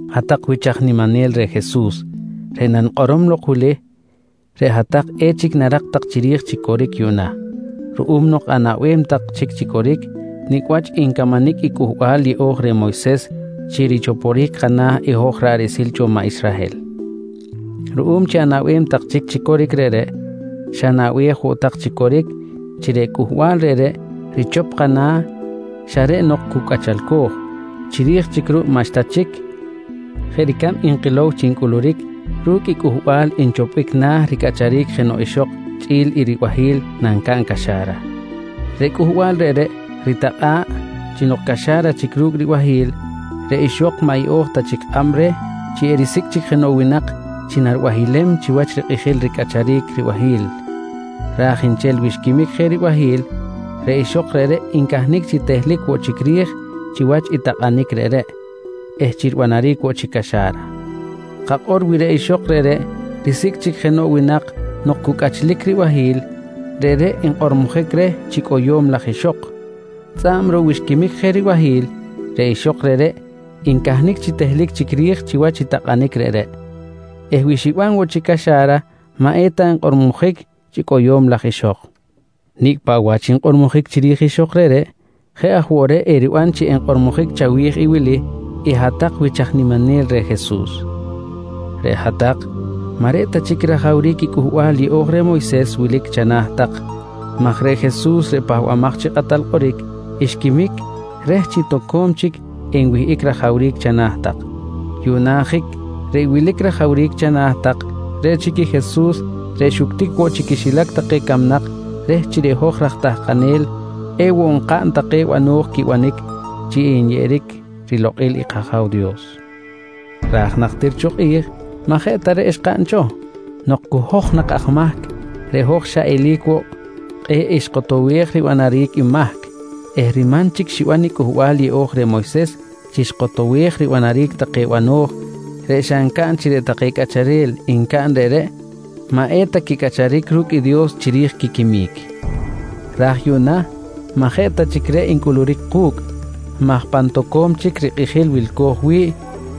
Hat-tak wich aj niminel reh Jesus, reꞌ nanikꞌorom lok wili reꞌ hat-tak echic narak tak chiri̱j chi coric yuꞌna, ruꞌum nok anaꞌbem tak chic chi coric nicꞌ wach ncamanic i Cꞌuhbal Yeꞌo̱j reh Moyses chi richoporic kana̱ i hoj ra̱ꞌ riꞌsil cho maꞌ Israhel. Ruꞌum chi anaꞌbem tak chic chi coric reꞌreꞌ, xanaꞌbej woꞌ tak chi coric chi reꞌ cꞌuhbal reꞌreꞌ richop kana̱ xa reꞌ nok cu cꞌachalco̱j, chiri̱j chic ruꞌ maꞌxta chic jeꞌ ricab nkilow chi ncꞌuluric ru̱cꞌ i cꞌuhbal nchopbic na̱ ricꞌacharic jenoꞌ ixok chꞌi̱l i ribahi̱l nancaꞌn caxa̱ra. Reꞌ cꞌuhbal reꞌreꞌ ritikꞌa̱ꞌ chi nok caxa̱ra chic ru̱cꞌ i ribahi̱l, reꞌ ixok maꞌ yeꞌo̱j ta chic kꞌab reh chi erisicꞌ chic jenoꞌ winak chi naribahilem chiwach rikꞌijil ricꞌacharic ribahi̱l, ra̱j nchel wi xquimic je i ribahi̱l reꞌ ixok reꞌreꞌ ncahnic chi tehlic woꞌ chic ri̱j chiwach i takꞌanic reꞌreꞌ eh chi ribanaric woꞌ chic caxa̱ra. Kakꞌor wi reꞌ ixok reꞌreꞌ risicꞌ chic jenoꞌ winak nok cu cꞌachlic ribahi̱l, reꞌreꞌ enkꞌormojic reh chi cꞌoyo̱m laj ixok, tzꞌa̱b ruꞌ wi xquimic je ribahi̱l reꞌ ixok reꞌreꞌ ncahnic chi tehlic chic ri̱j chiwach i takꞌanic reꞌreꞌ eh wi xiban woꞌ chic caxa̱ra maꞌ eta nkꞌormojic chi cꞌoyo̱m laj ixok. Nicꞌ paꞌ wach nkꞌormojic chiri̱j ixok reꞌreꞌ, jeꞌ aj woꞌ reꞌ eriban chi enkꞌormojic chawi̱j i wili i hat-tak wich aj niminel reh Jesus: Reꞌ hat-tak maꞌ reꞌ ta chic i rajawric i Cꞌuhbal Yeꞌo̱j reh Moyses wilic chana̱ tak maj reꞌ Jesus reꞌ Pahbamaj chi Kꞌatal Kꞌoric, xquimic reh chi toco̱m chic enwihꞌic rajawric chana̱ tak. Yuꞌna ajic reꞌ wilic rajawric chana̱ tak reꞌ chic i Jesus reꞌ xuctic woꞌ chi quixilac take camnak reh chi reꞌ hoj raj tahkanel ewoꞌ nkaꞌn take bano̱j quibanic chi nyeꞌeric rilokꞌil i kAja̱w Dios, ra̱j najtir cho kꞌi̱j maꞌ jeꞌ ta reꞌ xkaꞌn cho. Nok cu hoj nak aj mahc reꞌ hoj xa eli̱c woꞌ kꞌe̱ꞌ xkotowej ribanaric i mahc eh riman chic xiban i Cꞌuhbal Yeꞌo̱j reh Moyses chi xkotowej ribanaric take bano̱j reꞌ xa ncaꞌn chi reꞌ take cꞌacharel ncaꞌn reꞌreꞌ maꞌ eta quicꞌacharic ru̱cꞌ i Dios chiri̱j quiquimic. Ra̱j yuꞌna maꞌ jeꞌ ta chic reꞌ ncꞌuluric ku̱cꞌ maj pan toco̱m chic rikꞌijil wilco̱j wi̱ꞌ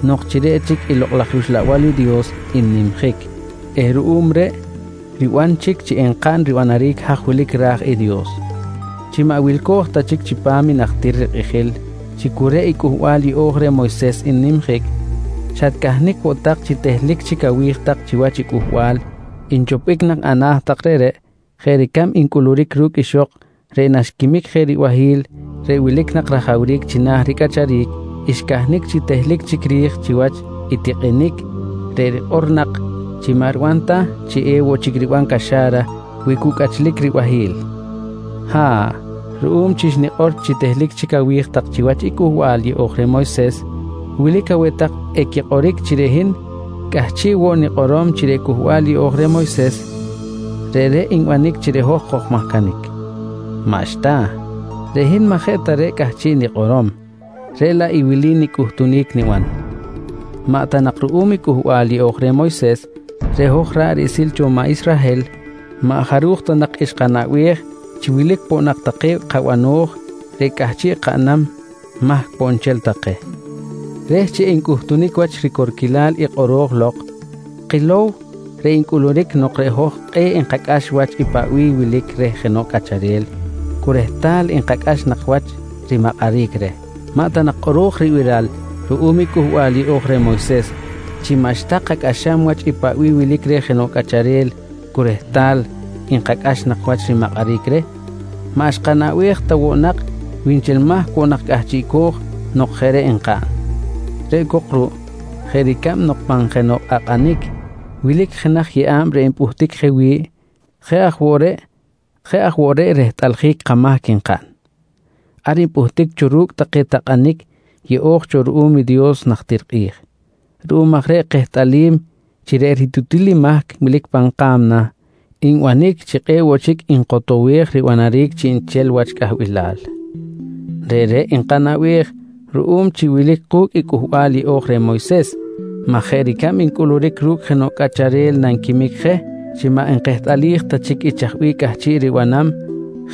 nok chi reꞌ chic i Lokꞌ laj rUxlabal i Dios n-nimjic eh ruꞌum reꞌ riban chic chi enkaꞌn ribanaric haj wilic ra̱j i Dios. Chi maꞌ wilco̱j ta chic chipam i najtir rikꞌijil chi cu reꞌ i Cꞌuhbal Yeꞌo̱j reh Moyses n-nimjic, xatcahnic woꞌ tak chi tehlic chic awi̱j tak chiwach i cꞌuhbal nchopbic nak ana̱ tak reꞌreꞌ jeꞌ ricab ncꞌuluric ru̱cꞌ ixok reꞌ naxquimic je ribahi̱l reꞌ wilic nak rajawric china̱ ricꞌacharic xcahnic chi tehlic chic ri̱j chiwach i tikꞌinic reꞌ rikꞌor nak chi maꞌ riban ta chi ewoꞌ chic riban caxa̱ra wi cu cꞌachlic ribahi̱l. Ha̱ꞌ, ruꞌum chi xnikꞌor chi tehlic chic awi̱j tak chiwach i Cꞌuhbal Yeꞌo̱j reh Moyses wilic aweh tak equikꞌoric chi reꞌ hin cꞌahchiꞌ woꞌ nikꞌorom chi reꞌ Cꞌuhbal Yeꞌo̱j reh Moyses reꞌreꞌ nbanic chi reꞌ hoj kojmahcanic. Maꞌxta, reꞌ hin maꞌ jeꞌ ta reꞌ cꞌahchiꞌ nikꞌorom reꞌ laꞌ i wili i nicꞌuhtunic niban: Maꞌ ta nak ruꞌum i Cꞌuhbal Yeꞌo̱j reh Moyses reꞌ hoj ra̱ꞌ riꞌsil cho maꞌ Israhel maꞌ jaruj ta nak xkanaꞌbej chi wilic poꞌ nak take kabano̱j reꞌ cꞌahchiꞌ kaꞌnam mahc poꞌ nchel take. Reh chi encꞌutunic wach ricorquilal i kꞌoro̱j lok, kilow reꞌ ncꞌuluric nok reꞌ hoj kꞌe̱ꞌ nkacꞌax wach i paꞌ bih wilic reh jenoꞌ cꞌacharel cu rehtal nkacꞌax nak wach rimakꞌaric reh. Maꞌ ta nak kꞌoro̱j ribiral ruꞌum i Cꞌuhbal Yeꞌo̱j reh Moyses chi maꞌxta kacꞌaxam wach i paꞌ bih wilic reh jenoꞌ cꞌacharel cu rehtal nkacꞌax nak wach rimakꞌaric reh maꞌ xkanaꞌbej ta woꞌ nak wi nchel mahc woꞌ nak cꞌahchiꞌco̱j nok jeꞌ reꞌ nkaꞌn. Reꞌ cok ruꞌ jeꞌ ricab nok pan jenoꞌ kꞌakꞌanic wilic jenaj yeꞌa̱b reꞌ npꞌuhtic je wi̱ꞌ, jeꞌ aj woꞌ reꞌ rehtꞌaljic i kamahc nkaꞌn, ar npꞌuhtic cho ru̱cꞌ take takꞌanic yeꞌo̱j cho ruꞌum i Dios najtir kꞌi̱j. Ruꞌum aj reꞌ kehtꞌalim chi reꞌ ritutil i mahc wilic pan ka̱mna nbanic chi kꞌe̱ꞌ woꞌ chic nkotowej ribanaric chiꞌnchel wach cꞌahbilal. Reꞌreꞌ nkanaꞌbej ruꞌum chi wilic ku̱cꞌ i Cꞌuhbal Yeꞌo̱j reh Moyses maj jeꞌ ricab ncꞌuluric ru̱cꞌ jenoꞌ cꞌacharel nanquimic je chi maꞌ nkehtꞌalij ta chic i chaj bih cꞌahchiꞌ ribanam,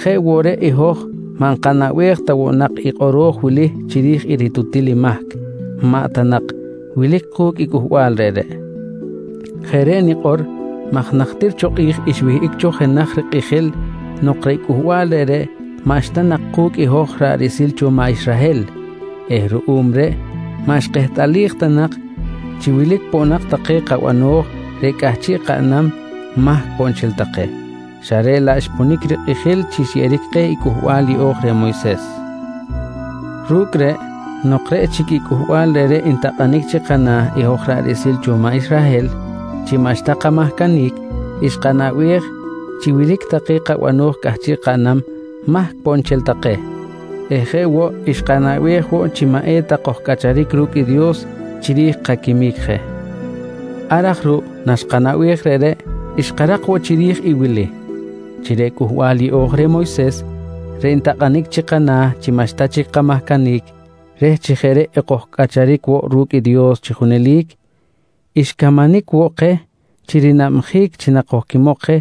jeꞌ woꞌ reꞌ i hoj maꞌ nkanaꞌbej ta woꞌ nak i kꞌoro̱j wili chiri̱j i ritutil i mahc maꞌ ta nak wilic ku̱cꞌ i cꞌuhbal reꞌreꞌ. Jeꞌ reꞌ nikꞌor maj najtir cho kꞌi̱j xwihꞌic cho jenaj rikꞌijil nok reꞌ cꞌuhbal reꞌreꞌ maꞌxta nak ku̱cꞌ i hoj ra̱ꞌ riꞌsil cho maꞌ Israhel eh ruꞌum reꞌ maꞌ xkehtꞌalij ta nak chi wilic poꞌ nak take kabano̱j reꞌ cꞌahchiꞌ kaꞌnam mahc poꞌ nchel take, xa reꞌ laꞌ xponic rikꞌijil chi xyeꞌeric keh i Cꞌuhbal Yeꞌo̱j reh Moyses. Ru̱cꞌ reꞌ, nok reꞌ chic i cꞌuhbal reꞌreꞌ ntakꞌanic chi kana̱ i hoj ra̱ꞌ riꞌsil cho maꞌ Israhel chi maꞌxta kamahcanic, xkanaꞌbej chi wilic take kabano̱j cꞌahchiꞌ kaꞌnam, mahc poꞌ nchel take eh jeꞌ woꞌ xkanaꞌbej woꞌ chi maꞌ eta kojcꞌacharic ru̱cꞌ i Dios chiri̱j kaquimic je. Ar aj ruꞌ naxkanaꞌbej reꞌreꞌ xkarak woꞌ chiri̱j i wili: Chi reꞌ Cꞌuhbal Yeꞌo̱j reh Moyses reꞌ ntakꞌanic chi kana̱ chi maꞌxta chic kamahcanic reh chi jeꞌ reꞌ ekojcꞌacharic woꞌ ru̱cꞌ i Dios chi junelic, xcamanic woꞌ keh chi rinabjic chi nakojquimok je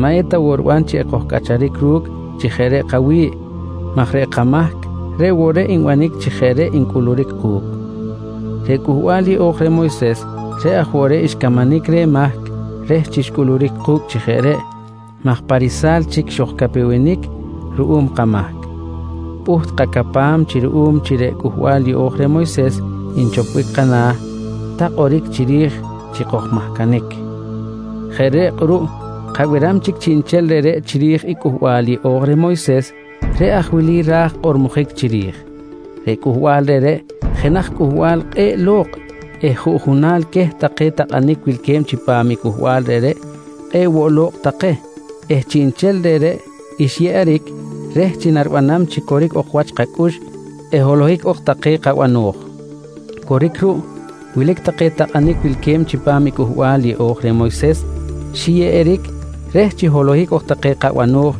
maꞌ eta woꞌ riban chi ekojcꞌacharic ru̱cꞌ chi jeꞌ reꞌ kawi̱ꞌ maj reꞌ kamahc reꞌ woꞌ reꞌ nbanic chi jeꞌ reꞌ ncꞌuluric ku̱cꞌ. Reꞌ Cꞌuhbal Yeꞌo̱j reh Moyses reꞌ aj woꞌ reꞌ xcamanic reh mahc reh chi xcꞌuluric ku̱cꞌ chi jeꞌ reꞌ maj pa risa̱l chic xojcapewenic ruꞌum kamahc, pꞌuht kacapam chi ruꞌum chi reꞌ Cꞌuhbal Yeꞌo̱j reh Moyses nchopbic kana̱, ta kꞌoric chiri̱j chi kojmahcanic. Jeꞌ reꞌ kꞌuruꞌ kabiram chic chiꞌnchel reꞌreꞌ chiri̱j i Cꞌuhbal Yeꞌo̱j reh Moyses reꞌ aj wili ra̱j kꞌormojic chiri̱j: Reꞌ cꞌuhbal reꞌreꞌ jenaj cꞌuhbal kꞌe̱ꞌ lo̱kꞌ eh juꞌjunal queh take takꞌanic wilque̱b chipam i cꞌuhbal reꞌreꞌ kꞌe̱ꞌ woꞌ lo̱kꞌ take eh chiꞌnchel reꞌreꞌ, xyeꞌeric reh chi naribanam chi coric ok wach kacꞌux eh holohic ok take kabano̱j. Coric ruꞌ, wilic take takꞌanic wilque̱b chipam i Cꞌuhbal Yeꞌo̱j reh Moyses xiyeꞌeric reh chi holohic ok take kabano̱j,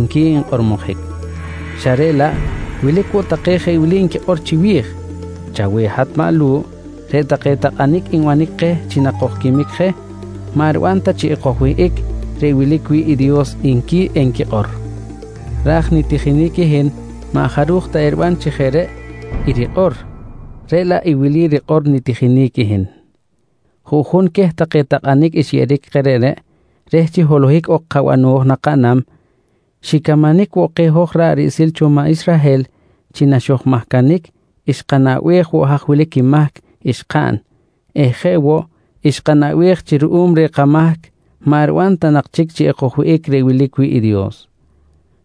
nqui nkꞌormojic xa reꞌ laꞌ wilic woꞌ take jeꞌ wili nquikꞌor chiwi̱j: «Chaweh hat maꞌ Lu̱ꞌ, reꞌ take takꞌanic nbanic keh chi nakojquimic je maꞌ riban ta chi ekojwihꞌic reꞌ wilic wi̱ꞌ i Dios, nqui enquikꞌor. Ra̱j nitijinic i hin maꞌ jaruj ta eriban chi jeꞌ reꞌ i rikꞌor, reꞌ laꞌ i wili rikꞌor nitijinic i hin: Juꞌjun queh take takꞌanic xyeꞌeric keh reꞌreꞌ reh chi holohic ok kabano̱j nakaꞌnam, xicamanic woꞌ keh i hoj ra̱ꞌ riꞌsil cho maꞌ Israhel chi naxojmahcanic xkanaꞌbej woꞌ haj wilic i mahc xkaꞌn eh jeꞌ woꞌ xkanaꞌbej chi ruꞌum reh kamahc maꞌ riban ta nak chic chi ekojwihꞌic reꞌ wilic wi̱ꞌ i Dios.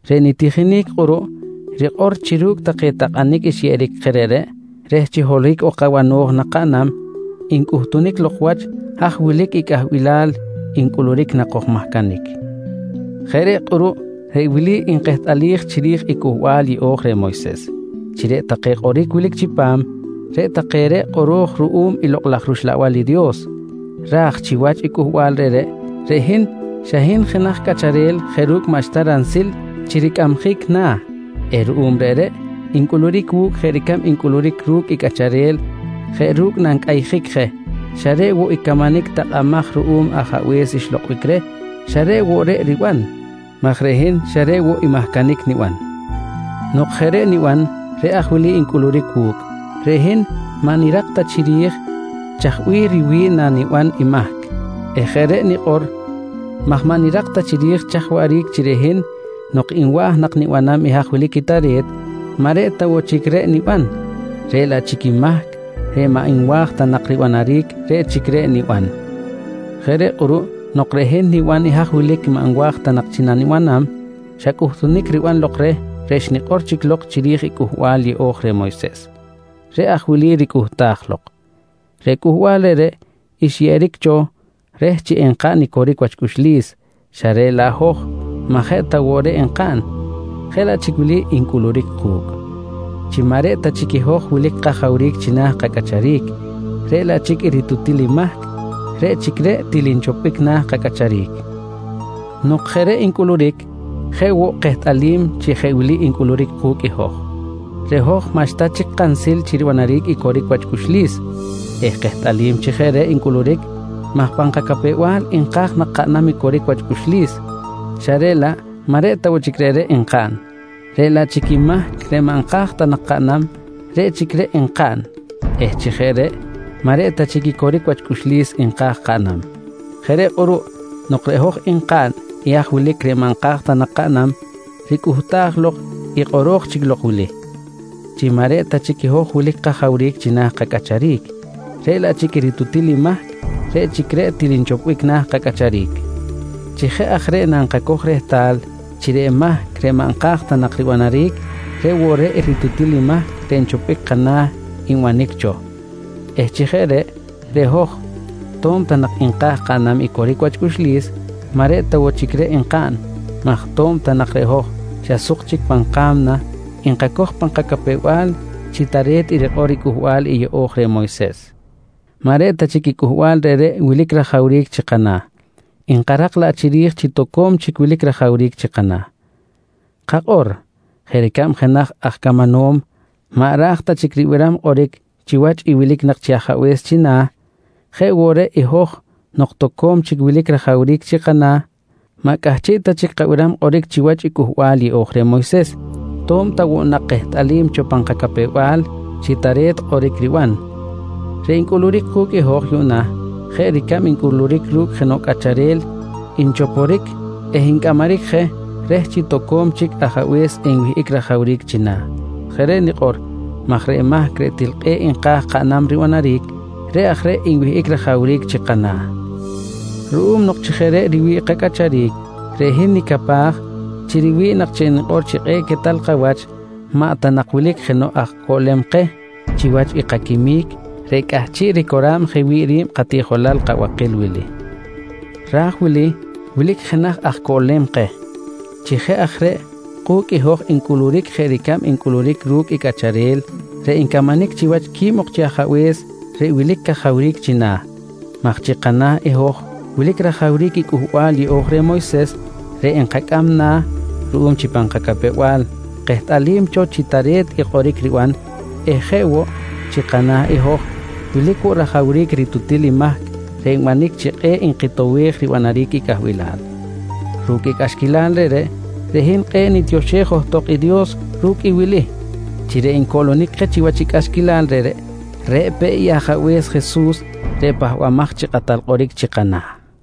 Reꞌ nitijinic kꞌuruꞌ rikꞌor chi ru̱cꞌ take takꞌanic xyeꞌeric keh reꞌreꞌ reh chi holohic ok kabano̱j nakaꞌnam ncꞌuhtunic lok wach haj wilic cꞌahbilal ncꞌuluric nakojmahcanic. Jeꞌ reꞌ kꞌuruꞌ reꞌ wili nkehtꞌalij chiri̱j i Cꞌuhbal Yeꞌo̱j reh Moyses: Chi reꞌ take kꞌoric wilic chipam reꞌ take reꞌ kꞌoro̱j ruꞌum i Lokꞌ laj rUxlabal i Dios. Ra̱j chiwach i cꞌuhbal reꞌreꞌ, reꞌ hin xa hin jenaj cꞌacharel jeꞌ ru̱cꞌ maꞌxta ransil chi ricꞌamjic na̱ eh ruꞌum reꞌreꞌ ncꞌuluric wu̱cꞌ jeꞌ ricab ncꞌuluric ru̱cꞌ i cꞌacharel jeꞌ ru̱cꞌ nancꞌayjic je, xa reꞌ woꞌ i camanic takꞌamaj ruꞌum ajabe̱s xlokꞌbic reh, xa reꞌ woꞌ reꞌ riban, maj reꞌ hin xa reꞌ woꞌ i mahcanic niban. Nok jeꞌ reꞌ niban, reꞌ aj wili ncꞌuluric wu̱cꞌ: Reꞌ hin maꞌ nirak ta chiri̱j chaj bih riwi̱ꞌ naniban i mahc eh jeꞌ reꞌ nikꞌor maj maꞌ nirak ta chiri̱j chaj waꞌric chi reꞌ hin nok nwa̱j nak nibanam i haj wilic i tare̱t, maꞌ reꞌ ta woꞌ chic reꞌ niban, reꞌ laꞌ chic i mahc reꞌ maꞌ nwa̱j ta nak ribanaric reꞌ chic reꞌ niban. Jeꞌ reꞌ kꞌuruꞌ nok reꞌ hin niban i haj wilic maꞌ nwa̱j ta nak chi nanibanam, xa cꞌuhtunic riban lok reh reꞌ xnikꞌor chic lok chiri̱j i Cꞌuhbal Yeꞌo̱j reh Moyses. Reꞌ aj wili ricꞌuhtaj lok: Reꞌ cꞌuhbal reꞌreꞌ xyeꞌeric cho reh chi enkaꞌn i coric wach cꞌuxlis xa reꞌ laꞌ hoj maꞌ jeꞌ ta woꞌ reꞌ nkaꞌn, jeꞌ laꞌ chic wili ncꞌuluric ku̱cꞌ: Chi maꞌ reꞌ ta chic i hoj wilic kajawric china̱ kacꞌacharic, reꞌ laꞌ chic i ritutil mahc reꞌ chic reꞌ til nchopbic na̱ kacꞌacharic. Nok jeꞌ reꞌ ncꞌuluric, jeꞌ woꞌ kehtꞌalim chi jeꞌ wili ncꞌuluric ku̱cꞌ i hoj: Reꞌ hoj maꞌxta chic kansil chi ribanaric i coric wach cꞌuxlis eh kehtꞌalim chi jeꞌ reꞌ ncꞌuluric maj pan kacapew-bal nka̱j nak kaꞌnam i coric wach cꞌuxlis xa reꞌ laꞌ maꞌ reꞌ ta woꞌ chic reꞌreꞌ nkaꞌn, reꞌ laꞌ chic i mahc reꞌ maꞌ nka̱j ta nak kaꞌnam, reꞌ chic reꞌ nkaꞌn eh chi jeꞌ reꞌ, maꞌ reꞌ ta chic i coric wach cꞌuxlis nka̱j kaꞌnam. Jeꞌ reꞌ kꞌuruꞌ nok reꞌ hoj nkaꞌn i haj wilic reꞌ maꞌ nka̱j ta nak kaꞌnam, ricꞌuhtaj lok i kꞌoro̱j chic lok wili: Chi maꞌ reꞌ ta chic i hoj wilic kajawric china̱ kacꞌacharic, reꞌ laꞌ chic i ritutil mahc reꞌ chic reꞌ til nchopbic na̱ kacꞌacharic. Chi jeꞌ aj reꞌ nankacoj rehtal chi reꞌ mahc reꞌ maꞌ nka̱j ta nak ribanaric reꞌ woꞌ ritutil i mahc reꞌ nchopbic kana̱ nbanic cho eh chi jeꞌ reꞌ, reꞌ hoj to̱b ta nak nka̱j kaꞌnam i coric wach cꞌuxlis maꞌ reꞌ ta woꞌ chic reꞌ nkaꞌn maj to̱b ta nak reꞌ hoj xa suk chic pan ka̱mna nkacoj pan kacapew-bal chi tare̱t rikꞌor i Cꞌuhbal Yeꞌo̱j reh Moyses, maꞌ reꞌ ta chic i cꞌuhbal reꞌreꞌ wilic rajawric chi kana̱, nkarak laꞌ chiri̱j chi toco̱m chic wilic rajawric chi kana̱. Kakꞌor jeꞌ ricab jenaj aj camanom maꞌ ra̱j ta chic ribiram kꞌoric chiwach i wilic nak chi ajabe̱s china̱, jeꞌ woꞌ reꞌ i hoj nok toco̱m chic wilic rajawric chi kana̱, maꞌ cꞌahchiꞌ ta chic kabiram kꞌoric chiwach i Cꞌuhbal Yeꞌo̱j reh Moyses to̱b ta woꞌ nak kehtꞌalim cho pan kacapew-bal chi tare̱t i kꞌoric riban. Reꞌ ncꞌuluric ku̱cꞌ i hoj yuꞌna jeꞌ ricab ncꞌuluric ru̱cꞌ jenoꞌ cꞌacharel nchoporic eh ncꞌamaric je reh chi toco̱m chic ajabe̱s enwihꞌic rajawric china̱. Jeꞌ reꞌ nikꞌor maj reꞌ mahc reꞌ til kꞌe̱ꞌ nka̱j kaꞌnam ribanaric, reꞌ aj reꞌ nwihꞌic rajawric chi kana̱. Ruꞌum nok chi jeꞌ reꞌ riwi̱ꞌ kacꞌacharic, reꞌ hin nicapaj chi riwi̱ꞌ nak chi enikꞌor chi kꞌe̱ꞌ quetal kawach maꞌ ta nak wilic jenoꞌ aj coꞌlem keh chiwach i kaquimic reꞌ cꞌahchiꞌ ricora̱b je wi̱ꞌ ri̱b katiꞌjolal kabakil wili. Ra̱j wili wilic jenaj aj coꞌlem keh. Chi jeꞌ aj reꞌ ku̱cꞌ i hoj ncꞌuluric jeꞌ ricab ncꞌuluric ru̱cꞌ i cꞌacharel reꞌ ncamanic chiwach quib ok chi ajabe̱s reꞌ wilic i cajawric china̱, maj chi kana̱ i hoj wilic rajawric Cꞌuhbal Yeꞌo̱j reh Moyses reꞌ nkacꞌam na̱ ruꞌum chi pan kacapew-bal kehtꞌalim cho chi tare̱t i kꞌoric riban eh jeꞌ woꞌ chi kana̱ i hoj wilic woꞌ rajawric ritutil i mahc reꞌ nbanic chi kꞌe̱ꞌ nkitowej ribanaric i cꞌahbilal. Ru̱cꞌ i cꞌaxquilal reꞌreꞌ, reꞌ hin kꞌe̱ꞌ nitioxej johtok i Dios ru̱cꞌ i wili: Chi reꞌ ncoꞌlonic keh chiwach i cꞌaxquilal reꞌreꞌ, reꞌ peꞌ Ajabe̱s Jesus reꞌ Pahbamaj chi Kꞌatal Kꞌoric chi kana̱!